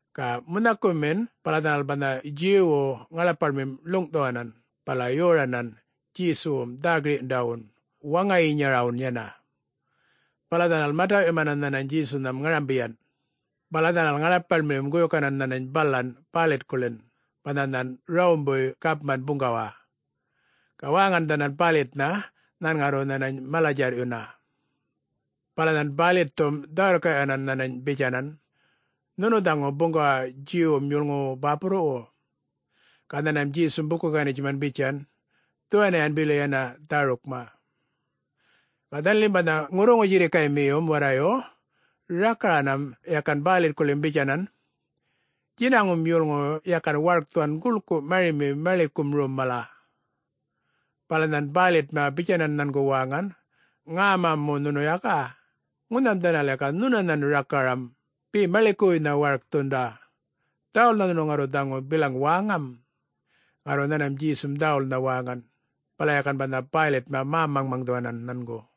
Ga munhakumin, bala dhanal banha Djuwwu ŋaḻapaḻmim ḻuŋꞌthuwanan bala yoranan Djesuwum dhä-girꞌyundawun waŋayinyarawun yana. Bala dhanal mataꞌyumanan nhanany Djesunham ŋarambiyan, bala dhanal ŋaḻapaḻmiyum guyukanan nhanany balan Bäylitkuḻin banha nhan Rawumbuy gapman buŋgawa. Ga wäŋan dhanal Bäylitnha nhan ŋarru nhanany mala-djarrꞌyuna. Bala nhan Bäylitthum dhä-wirrkaꞌyuwanan nhanany bitjanan, “Nhunu dhaŋu buŋgawa Djuwwum yolŋuwu bäpurruwu?” Ga nhanmam Djesum buku-ganitjuman bitjan, “Dhuwaniyan bili yana dhärukma.” Ga dhanalim banha ŋurruŋu-djirrkaymiyum warrayu rakaranam yakan Bäylitkuḻim bitjanan, “Djinaŋum yolŋuyu yakan warkthuwan guḻkun marimin maḻikum rom mala.” Bala nhan Bäylitma bitjanan nhangu wäŋan, “Ŋäma mu nhunu yaka? Ŋunham dhanal yaka nhunanhan rakaramam be maḻikuwuynha warkthunda. Dhäwulnha nhunu ŋarru dhaŋu bilaŋ wäŋam?” Ŋarru nhanmam Djesum dhäwulnha wäŋan, bala yakan banha Bäylitma mä-maŋmaŋdhuwanan nhangu.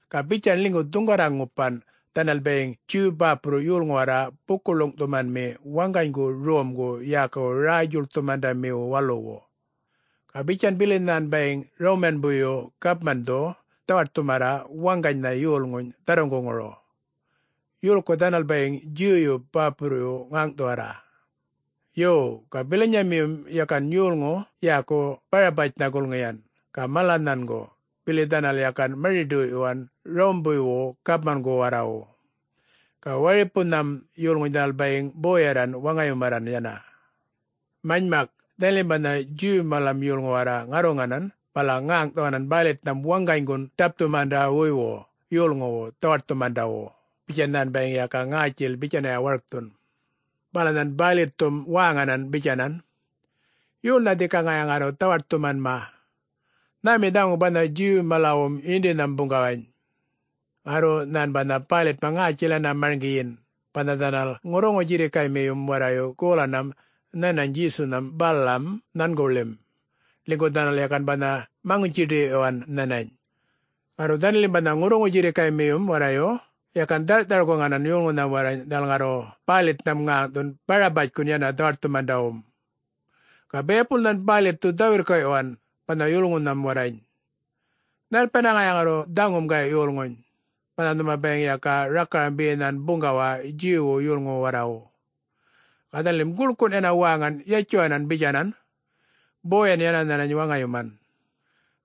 Ga bitjan ḻinygu dhuŋgarra-ŋupan dhanal bayiŋ Djuw bäpurru yolŋu warra buku-ḻuŋꞌthumanmi waŋganygu romgu yäkuwu Räy-djuḻkthumandmiwu Waluwu. Ga bitjan bili nhan bayiŋ Rawmanbuyyu Gapmandhu dhawaṯthumarra waŋganynha yolŋuny dharruŋguŋuru, yolku dhanal bayiŋ Djuwyu bäpurruyu ŋäŋꞌthuwarra. Yo, ga bilanyamiyum yakan yolŋu yäku Barabatjnha gulŋiyan ga mala nhangu bili dhanal yakan mari-ḏoyꞌyuwan Rawumbuywu gapmangu warrawu. Ga waripunham yolŋuny dhanal bayiŋ boyarran waŋayumarran yana. Manymak, dhanalim banha Djuw malam yolŋu warra ŋarruŋanan bala ŋäŋꞌthuwanan Bäylitnham waŋganygun ḏapthumandawuywu yolŋuwu dhawaṯthumandawu, bitjan nhan bayiŋ yaka ŋätjil bitjanya warkthun. Bala nhan Bäylitthum wäŋanan bitjanan, “Yolnha dhika ŋaya ŋarru dhawaṯthumanma? Nhämi dhaŋu banha Djuw-malawum yindinham buŋgawany?” Ŋarru nhan banha Bäylitma ŋätjil yana mariŋgiyin banha dhanal ŋurruŋu-djirrikaymiyum warrayu golanam nhanany Djesunham balam nhanguḻim, ḻinygu dhanal yakan banha maŋutji-ḏiyꞌyuwan nhanany. Ŋarru dhanalim banha ŋurruŋu-djirrikaymiyum warrayu yakan dharꞌthar-guŋanan yolŋunham warrany dhanal ŋarru Bäylitnham ŋäŋꞌṯhun Barabatjkun yana dhawaṯthumandawum. Ga biyapul nhan Bäylitthu dhä-wirrkaꞌyuwan banha yolŋunham warrany, “Nhalpiyana ŋaya ŋarru dhaŋum gayꞌ yolŋuny, banha nhuma bayiŋ yaka rakaram be nhan buŋgawa Djuwwu yolŋuwu warrawu?” Ga dhanalim guḻkun yana wäŋan yatjuwanam bitjanan, “Boyan yana nhanany waŋayuman!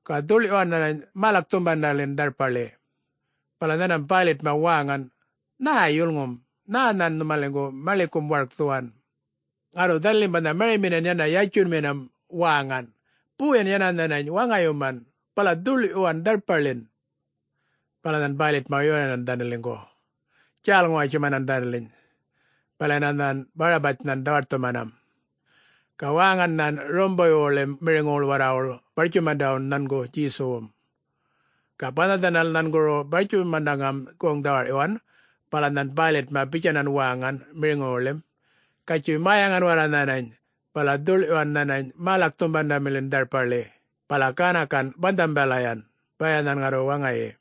Ga dhuḻꞌyuwan nhanany mälakthumandamiḻin dharpaḻi!” Bala nhanmam Bäylitma wäŋan, “Nhä yulŋum? Nhä nhan nhumaliŋgu maḻikum warkthuwan?” Ŋarru dhanalim banha mariminan yana yatjunminam wäŋan, “Boyan yana nhanany waŋayuman, bala dhuḻꞌyuwan dharpaḻin!” Bala nhan Bäylitma yoranan dhanaliŋgu, djäl-ŋuwatjumanan dhanaliny. Bala yana nhan Barabatjnhan dhawaṯthumanam. Ga wäŋan nhan Rawumbuywuḻim miriŋuwuḻ warrawuḻ bartjumandawun nhangu Djesuwum. Ga banha dhanal nhanguru bartjumandaŋam goŋ-dhawarꞌyuwan bala nhan Bäylitma bitjanan wäŋan miriŋuwuḻim, “Gatjuy mäyaŋan warra nhanany bala dhuḻꞌyuwan nhanany mälakthumandamiḻin dharpaḻi bala ganakan banhambalayan, baya nhan ŋarru waŋayi.”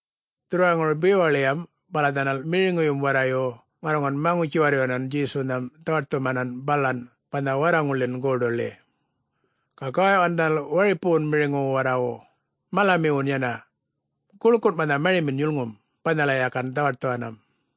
Dhurrwaraŋuru bewaḻiyam bala dhanal miriŋuyum warrayu ŋarruŋan maŋutji-warryuwanan Djesunham dhawaṯthumanan balan banha warraŋulḻin goḏuḻi. Ga gawaꞌyuwan dhanal waripuwun miriŋuwu warrawu, malamiwun yana, guḻkun banha marimin yulŋum, balayan yakan dhawaṯthuwan.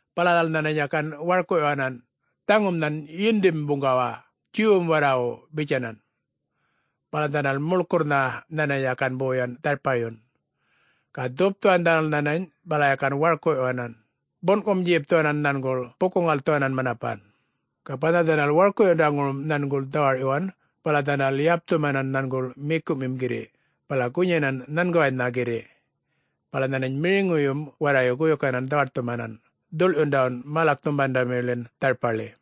Bala dhanal nhanany yakan warkuꞌyuwanan, “Dhaŋun nhan yindim buŋgawa, Djuwwum warrawu!” bitjanan. Bala dhanal muḻkurrnha nhanany yakan boyan dharpayun, ga dhupthuwan dhanal nhanany bala yakan warkuꞌyuwanan, bunꞌkumu-djipthuwanan nhanguḻ buku-ŋalthuwanan manapan. Ga banha dhanal warkuꞌyundaŋurum nhanguḻ dhawarꞌyuwan, bala dhanal yapthumanan nhanguḻ mikuꞌmim girriꞌ bala gunyanam nhanguwaynha girriꞌ. Bala nhanany miriŋuyum warrayu guyukanan dhawaṯthumanan dhuḻyundawun mälakthumandaḻin dharpaḻi.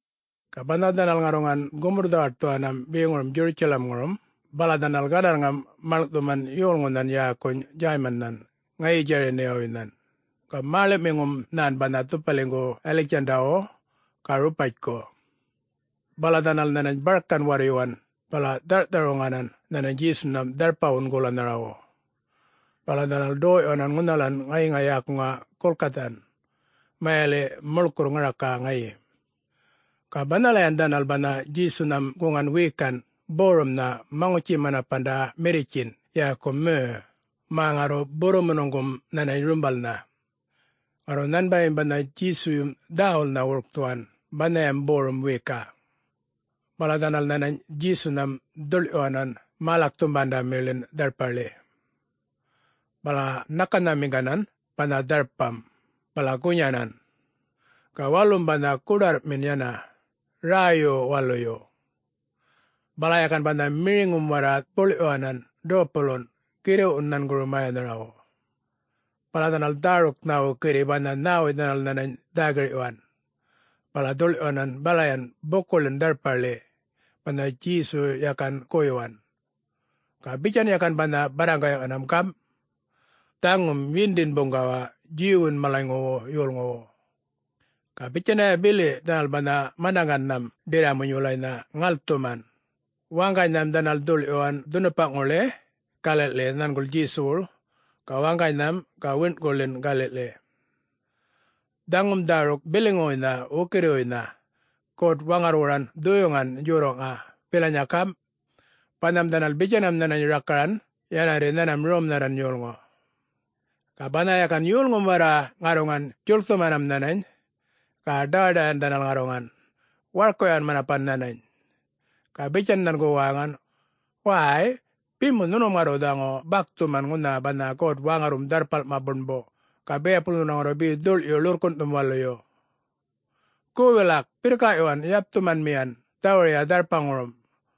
Ga banha dhanal ŋarruŋan gumurr-dhawaṯthuwanam beŋurum Djurutjalamŋurum, bala dhanal gandarrŋam maḻŋꞌthuman yolŋunhan yäkuny Djäymannhan ŋayi Djäriniwuynhan. Ga mäḻuꞌmiŋum nhan banha dhupaliŋgu Yaliktjandawu ga Ropatjku. Bala dhanal nhanany barkan warryuwan bala dharꞌthar-wuŋanan nhanany Djesunham dharpawun golanharawu. Bala dhanal ḏoyꞌyuwanan ŋunhalayan ŋayiŋa yäkuŋa Gulgathan, mayaliꞌ, ‘Muḻkurr Ŋaraka Ŋayi’. Ga banhalayan dhanal banha Djesunham guŋan wiyikanꞌ borumnha maŋutji-manapanda mirritjinꞌ yäku merr, mä ŋarru burrumunuŋgum nhanany rumbalnha. Ŋarru nhanbayim banha Djesuyum dhäwulnha wurkthuwan banhayam borum wiyikaꞌ. Bala dhanal nhanany Djesunham dhuḻꞌyuwanan mälakthumandaḻin dharpaḻi. Bala ṉakanhamiŋganan banha dharpam, bala gunyanan. Ga walum banha goḏarrꞌmi yana, räyyu-waluyu. Bala yakan banha miriŋum warra buḻꞌyuwanan dopulunꞌ girriꞌwun nhanguru mäyanharawu. Bala dhanal dhäruknha wukirri banha nhäwuy dhanal nhanany dhä-girꞌyuwan, bala dhuḻꞌyuwanan balayan bukuḻin dharpaḻi, banha Djesu yakan goyuwan. Ga bitjan yakan banha barraŋgaꞌyuwanam, gamꞌ, “Dhaŋum Yindin Buŋgawa Djuwwun malawu yolŋuwu.” Ga bitjanya bili dhanal banha manaŋgannham ḏirramuny wulanynha ŋalthuman, waŋganynham dhanal dhuḻꞌyuwan dhunupaꞌŋuḻi galiꞌḻi nhanguḻ Djesuwuḻ, ga waŋganynham ga wiṉꞌkuḻin galiꞌḻi. [Dhaŋum dhäruk biliŋuwuynha wukirriwuynha God-Waŋarrwuran Dhuyuŋan Djorraꞌŋa bilanya gamꞌ, “Banham dhanal bitjanam nhanany rakaran, yana warri nhanmam romnharran yolŋu.”] Ga banha yakan yolŋum warra ŋarruŋan djuḻkthumanam nhanany, ga ḏawaḏawꞌyuwan dhanal ŋarruŋan, warkuꞌyuwan manapan nhanany. Ga bitjan nhangu wäŋan, “Wäy, be mu nhunum ŋarru dhaŋu bakthuman ŋunha banha God-Waŋarrwum Dharrpalma Buṉbu, ga biyapul nhunu ŋarru be dhuḻꞌyu ḻurrkunꞌthum waluyu? Gu, wilak birrkaꞌyuwan yapthumanmiyan dhawuruya dharpaŋurum,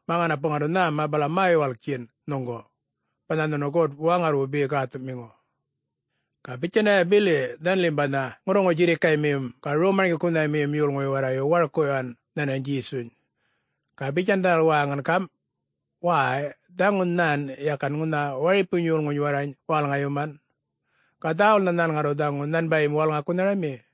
mä ŋanapu ŋarru nhäma bala mä-yuwalktjin nhuŋgu, banha nhunu God-Waŋarrwum be gäthuꞌmiŋu?” Ga bitjanya bili dhanalim banha ŋurruŋu-djirrikaymiyum ga rom-marŋgikunhamiyum yolŋuyu warrayu warkuꞌyuwan nhanany Djesuny. Ga bitjan dhanal wäŋan gamꞌ, “Wäy, dhaŋu nhan yakan ŋunha waripuny yolŋuny warrany wälŋayuman,... ga dhäwulnha nhan ŋarru dhaŋu nhanbayim wälŋakunharami?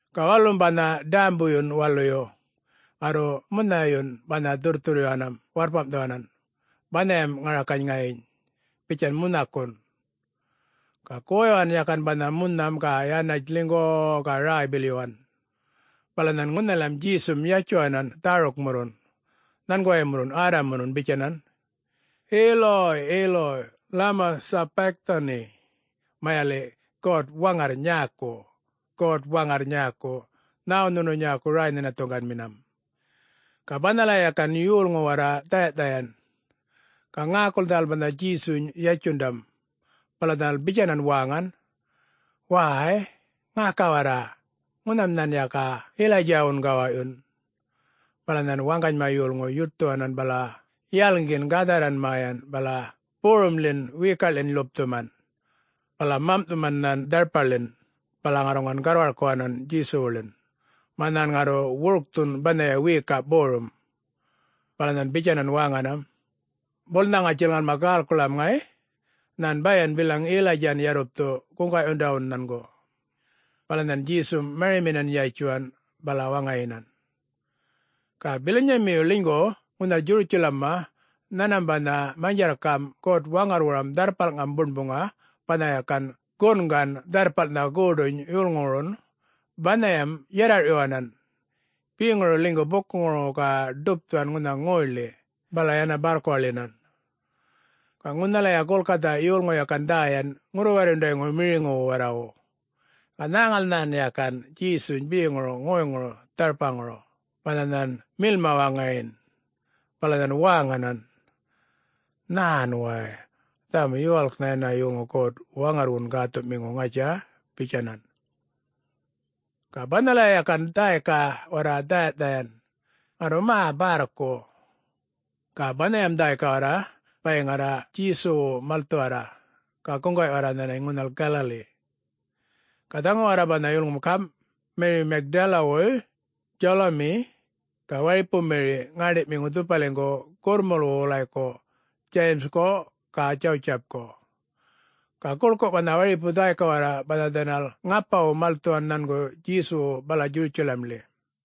Ga walum banha ḏämbuyun waluyu, ŋarru munhayun banha dhurrthurryuwanam warrpamꞌthuwanan banhayam ŋarakany ŋayiny, bitjan munhakun. Ga goyuwan yakan banha munham ga yanatj ḻinygu-u-u ga räy-bilyuwan. Bala nhan ŋunhalam Djesum yatjuwanan dhärukmurrun nhangurumurru Arram-murrun bitjanan, “Eloi, Eloi, lema sabachthani?” (mayaliꞌ, God-Waŋarr nyäku, God-Waŋarr nyäku, nhäwu nhunu nyäku räy-nhinathuŋganminam?”) Ga banhalaya yakan yolŋu warra dhayaꞌdhayan, ga ŋäkul dhanal banha Djesuny yatjundam. Bala dhanal bitjanan wäŋan, “Way, ŋäka warra! Ŋunham nhan yaka Yilaydjawun gawaꞌyun.” Bala nhan waŋganyma yolŋu yuṯthuwanan bala yalŋgin gadharran mäyan bala borumḻin wiyikaꞌḻin ḻupthuman. Bala mamꞌthuman nhan dharpaḻin bala ŋarruŋan garrwarkuwanan Djesuwuḻin, mä nhan ŋarru wurkthun banhaya wiyikaꞌ borum. Bala nhan bitjanan wäŋanam, “Bulnha ŋatjil ŋalma gäḻkuḻam ŋay, nhan bayan bilaŋ Yilaydjan yarrupthu guŋgaꞌyundawun nhangu.” Bala nhan Djesum mariminan yatjuwan, bala waŋayinan. Ga bilanyamiyu ḻinygu ŋunhal Djurutjalamma nhanmam banha manydjarrkamꞌ God-Waŋarrwuram Dharrpalŋam Buṉbuŋa banha yakan gungan dharrpalnhan goḏuny yolŋuwurun, banhayam yarrarꞌyuwanan, beŋuru ḻinygu bukuŋuru ga ḏupthuwan ŋunha ŋoyḻi, bala yana bärrkuwaḻyinan. Ga ŋunhalaya Gulgatha yolŋu yakan dhäyan ŋurru-warryundayŋu miriŋuwu warrawu, ga nhäŋal nhan yakan Djesuny beŋuru ŋoyŋuru dharpaŋuru banha nhan milma waŋayin. Bala nhan wäŋanan, “Nhän way! Dhaŋum yuwalknha yana yolŋu God-Waŋarrwun Gäthuꞌmiŋu, ŋatja?” bitjanan. Ga banhalaya yakan dhäyka warra dhäya-dhayan, ŋarru mä bärrku. Ga banhayam dhäyka warra bayiŋ garra Djesuwu malthuwarra, ga guŋgaꞌyuwarra nhanany ŋunhal Galali. Ga dhaŋu warra banha yulŋum gamꞌ: Meri Magdalawuy, Djalumi, ga waripu Meri, ŋäṉḏiꞌmiŋu dhupaliŋgu gurrmulwu wulayku Djayimgu ga Djawutjipku, ga guḻku banha waripu dhäyka warra banha dhanal ŋapawu malthuwan nhangu Djesuwu bala Djurutjalamḻi.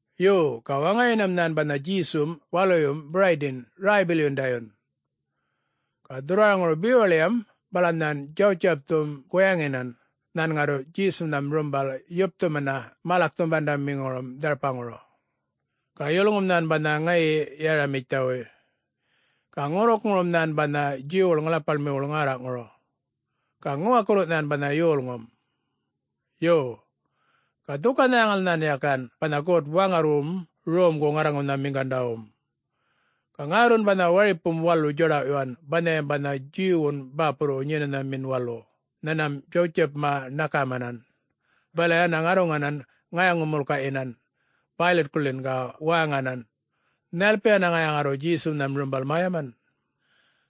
Yo, ga waŋayinam nhan banha Djesum waluyum Biraydin räy-bilyundayun. Ga dhurrwaraŋuru bewaḻiyam bala nhan Djawutjipthum guyaŋinan nhan ŋarru Djesunham rumbal yapthumana mälakthumandamiŋurum dharpaŋuru. Ga yolŋum nhan banha ŋayi Yaramithiyawuy, ga ŋurrukŋurum nhan banha Djuwwuḻ ŋaḻapaḻmiwuḻ ŋärraꞌŋuru. Ga ŋuwakurru nhan banha yolŋum. Yo, ga dhuka-nhäŋal nhan yakan banha God-Waŋarrwum romgu-ŋarruŋanhamiŋgandawum. Ga ŋärrun banha waripum walu djaḏawꞌyun banhayam banha Djuwwun bäpurruwu Nyenanhamin Walu, nhanmam Djawtjipma ṉakamanan, bala yana ŋarruŋanan ŋayaŋu-mulkaꞌyinan Bäylitkuḻin ga wäŋanan, “Nhalpiyan ŋaya ŋarru Djesunham rumbal mäyaman?”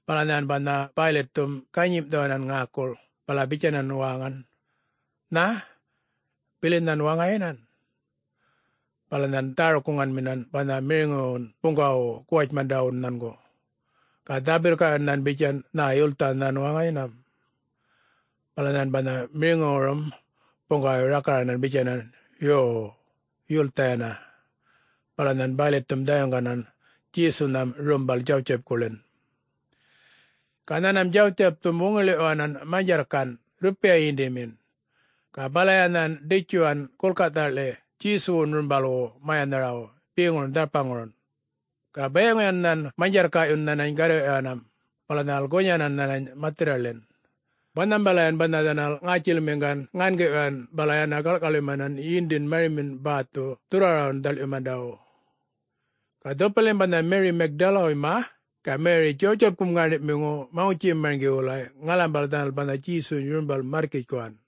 Bala nhan banha Bäylitthum ganyimꞌthuwanan ŋäkul, bala bitjanan wäŋan, “Nhä, bilin nhan waŋayinan?” Bala nhan dhäruk-guŋganminan banha miriŋuwun buŋgawawu guwatjmandawun nhangu, ga dhä-wirrkaꞌyuwan nhan bitjan, “Nhä, yulthan nhan waŋayinam?” Bala nhan banha miriŋuwurum buŋgawayu rakaran bitjanan, “Yuw, yulthan yana!’ Bala nhan Bäylitthum dhayuŋganan Djesunham rumbal Djawutjipkuḻin. Ga nhanmam Djawutjipthum wuŋiḻiꞌyuwanan manydjarrkanꞌ rrupiya yindimin, ga balaya nhan ḏitjuwan Gulgathaḻi Djesuwun rumbalwu mäyanharawu beŋurun dharpaŋurun. Ga bayiŋuyan nhan manydjarrkaꞌyu nhanany garrwiꞌyuwanam, bala dhanal gunyanan nhanany mathirraḻin, banhambalayan banha dhanal ŋätjilmiŋgan ŋangiꞌyuwan bala yana gaḻꞌkaḻyumanan yindin marimin bäthum dhurrwarawum dhaḻꞌyundawu. Ga dhupalim banha Meri Magdalawuyma ga Meri Djawutjipkum ŋäṉḏiꞌmiŋu maŋutji-marŋgin wulay ŋalambal dhanal banha Djesuny rumbal märrkitjkuwan.